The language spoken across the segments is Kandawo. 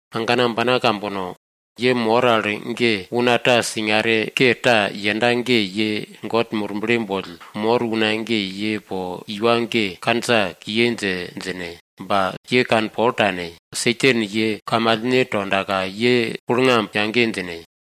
Agana ambana kambono! Ye mor al ge una ta singare ke ta yenda ge, ye God Murble boll mor una ge, ye po une ge kandja kiye dje djine. Ba ye kanpol tane. Satan ye kamalne tondaka, ye kulngamb yage djine.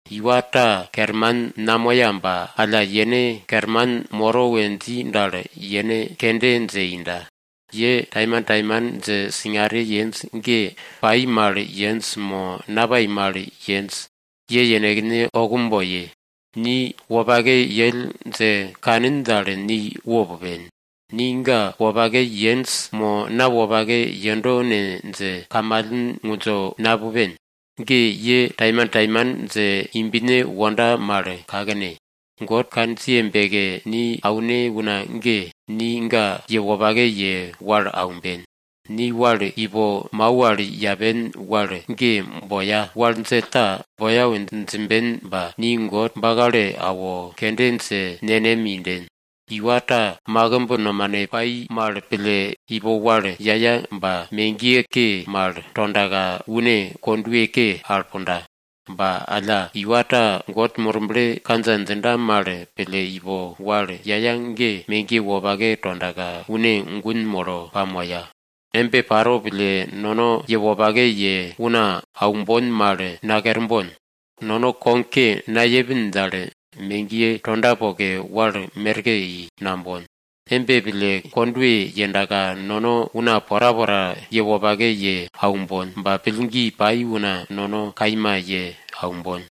Iwa ta kerman namoya ba alla yene kerman moro we dji dal, yene kende dje inda. Ye taimantaiman dje singare yenj ge, pai mal yenj mo napai mal yenj? Ye yenekne okum boye. Ni wopake yell dje kanin dal, ni wo pupen. Ni ga wopake yenj mo na wopake yendo ne dje kamalen ngundjo napupen. Ge ye taimantaiman dje imbne wonda mal kakne. God kandjiye beke ni aune una ge, ni ga ye wopake ye wal aumben. Ni wal ipo mau al yapen wal ge boya, wal djell ta boya we djimben ba, ni God bakalo awo, kende dje nenem inden. Iwa ta makimb nomane pai mal pille ipo wal yaya ba, megiye ke mal tondaka une kondwe ke yero al punda. Ba alla, iwa ta God Murble kandja djinda mal pille ipo wal yaya ge, megiye wopake tondaka, une gun molo pamoya. Embe paro pille nono ye wopake ye una aumbon mal nakerbon. Nono kogke nayepin dal, megiye tonda poke, wal merke i nambon. Embe pille, kondwe yendaka nono una porapora ye wopake ye aumbon. Ba pillgi pai una nono kaima wopake ye aumbon.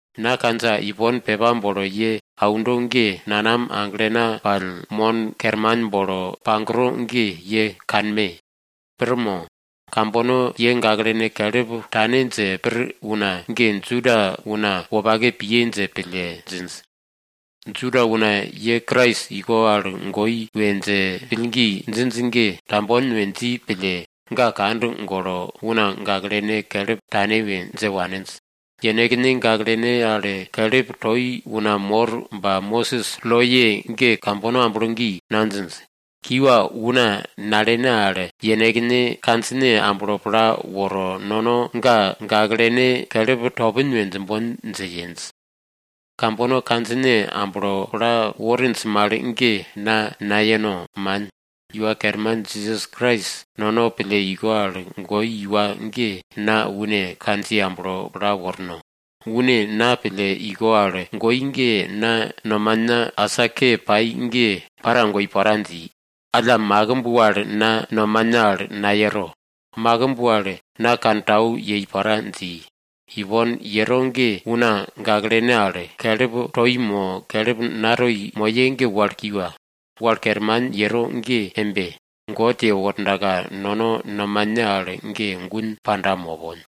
Na kandja ipon pepa bolo ye aundo ge, nanam aglena pall, mon kerman bolo pagro ge, ye kanme! Pir mo? Kambono ye gaklene kelip tane dje pir una ge, Juda una wopake piye dje pille djinj. Juda una pende ye Krais iko al goi we dje pillgi djinj ge, tambon we dji pille, ga kand golo una gaklene kelip tane we dje waninj. Yenekne gaklene al kelip toi una mor ba Mosis loye ge kambono amblo gi nadjinj. Kiwa, una nalene al yenekne kandjine amblo pla woro nono ga gaklene kelip topin we djimbon dje yenj. Kambono kandjine amblo pla worinj mal ge na nayeno, man. Iwa Kerman Jisas Krais nono pille iko al goi iwa ge na une kandjiye amblo pla worno. Une na pille iko al goi ge, na nomana asa ke pai ge para goi pora dji. Alla makimb wal na nomana al nayero, makimb wal na kantau yei pora dji. Ipon yero ge una gaklene al kelip toi mo kelip natoi moye ge wal kiwa. Wal kerman yero ge embe, God yewordaka, nono nomane al ge gun panda mopon.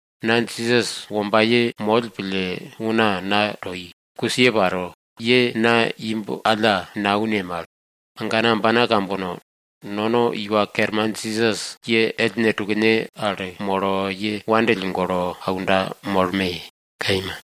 Na Jisas wombaye moll pille una na toi, kusiye paro, ye na imb alla naune mal. Agana ambana kambono, nono Iwa Kerman Jisas ye ellne tukne al molo, ye wopake pille aunda molme! Kaima.